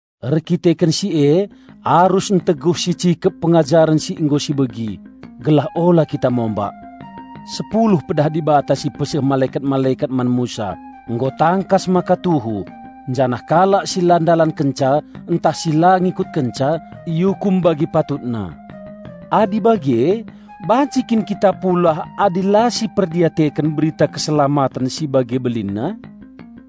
Erdandanken si e arus nteguh sicikep pengajaren si nggo sibegi, gelah ula kita mombak. Sepuluh Pedah Dibata si ipeseh malekat-malekat man Musa nggo tangkas maka tuhu, janah kalak si la ndalankenca ntah si la ngikutkenca iukum bagi patutna. Adi bage banci kin kita pulah adi la siperdiateken berita keselamaten si bage belinna?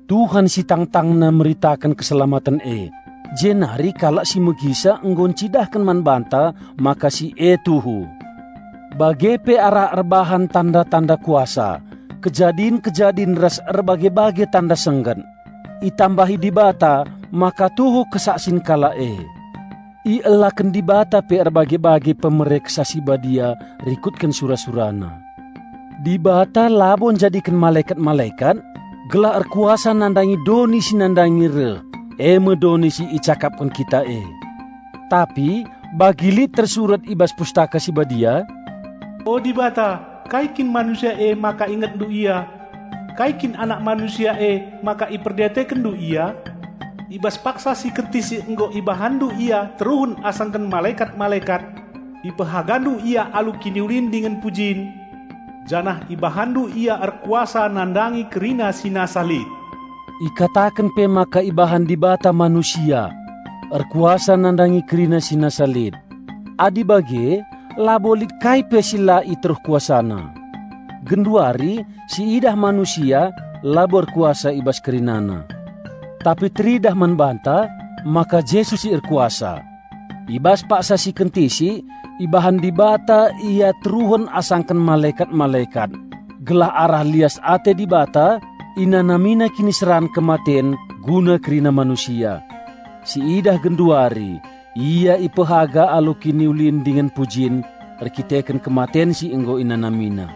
Tuhan si tangtangna meritaken keselamaten e, jenari kalak si megisa nggo ncidahken man banta maka si e tuhu. Bage pe arah erbahan tanda-tanda kuasa, kejadin-kejadin ras erbage-bage tanda sengget, itambahi Dibata maka tuhu kesaksin kalak e. Ielaken Dibata pe erbage-bage pemere Kesah Si Badia rikutken sura-SuraNa. Dibata labo njadiken malekat-malekat gelah erkuasa nandangi doni si nandangi reh eme doni si icakapken kita e. Tapi bagi lit tersurat i bas Pustaka Si Badia, "O Dibata, kai kin manusia emaka IngetNdu ia; kai kin anak manusia e, maka IperdiatekenNdu ia? I bas paksa si kentisik nggo IbahanNdu ia teruhen asangken malekat-malekat; IpehagaNdu ia alu kiniulin dingen pujin, janah IbahanNdu ia erkuasa nandangi kerina si nasa lit." Ikataken pe maka ibahan Dibata manusia "erkuasa nandangi kerina si nasa lit"; adi bage labo lit kai pe si la i teruh kuasana. Genduari si idah manusia labo erkuasa i bas kerinana. Tapi teridah man banta maka Jesus si erkuasa! I bas paksa si kentisik, ibahan Dibata Ia teruhen asangken malekat-malekat, gelah arah lias ate Dibata InanamiNa kiniseran kematen guna kerina manusia. Siidah genduari Ia ipehaga alu kiniulin dingen pujin erkiteken kematen si nggo InanamiNa.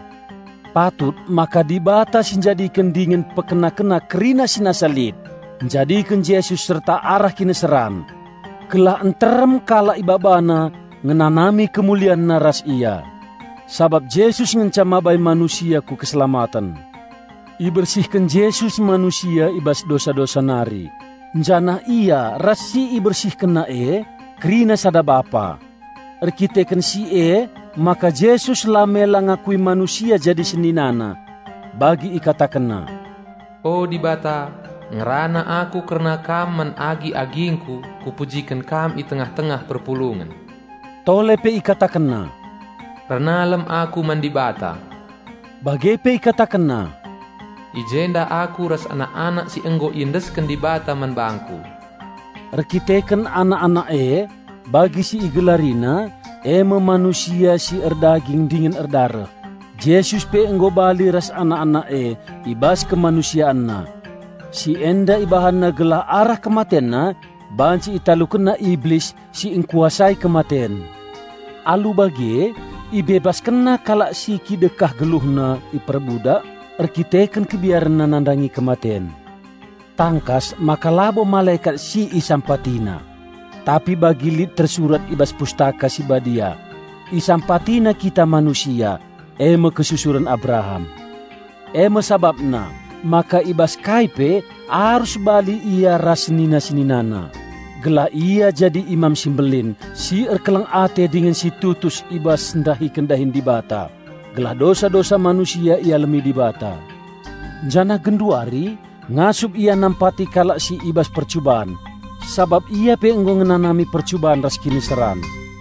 Patut maka Dibata si njadiken dingen pekena-kena kerina si nasa lit, njadiken Jesus serta arah kiniseran. Gelah nterem kalak IbabaNa ngenanami KemulianNa ras Ia. Sabap Jesus ngenca mabai manusia ku keselamaten. Ibersihken Jesus manusia i bas dosa-dosa nari, janah Ia ras si IbersihkenNa e kerina sada Bapa. Erdandanken si emaka Jesus la mela ngakui manusia jadi SeninaNa. Bagi IkatakenNa, "O Dibata, ngerana aku kerna Kam man agi-agingku kupujiken Kam i tengah-tengah perpulungen." Tole pe IkatakenNa, "Ernalem Aku man Dibata." Bage pe IkatakenNa, "I jenda Aku ras anak-anak si nggo iendesken Dibata man bangKu." Erdandanken anak-anak e, bagi si IgelariNa, e me manusia si erdaging dingen erdareh, Jesus pe nggo bali ras anak-anak e i bas KemanusianNa. Si enda IbahanNa gelah arah KematenNa banci ItalukenNa Iblis si engkuasai kematen. Alu bage IbebaskenNa kalak si kidekah geluhna iperbudak erkiteken kebiarenna nandangi kematen. Tangkas maka labo malekat si IsampatiNa. Tapi bagi lit tersurat i bas Pustaka Si Badia, "IsampatiNa kita manusia, e me kesusuren Abraham." E me sabapna maka i bas kai pe arus bali Ia ras senina-SeninaNa, gelah Ia jadi Imam si Mbelin si erkeleng ate dingen si tutus i bas ndahiken dahin Dibata gelah dosa-dosa manusia ialemi Dibata. Janah genduari ngasup Ia nampati kalak si i bas percuban, sabap Ia pe nggo ngenanami percuban ras kiniseran.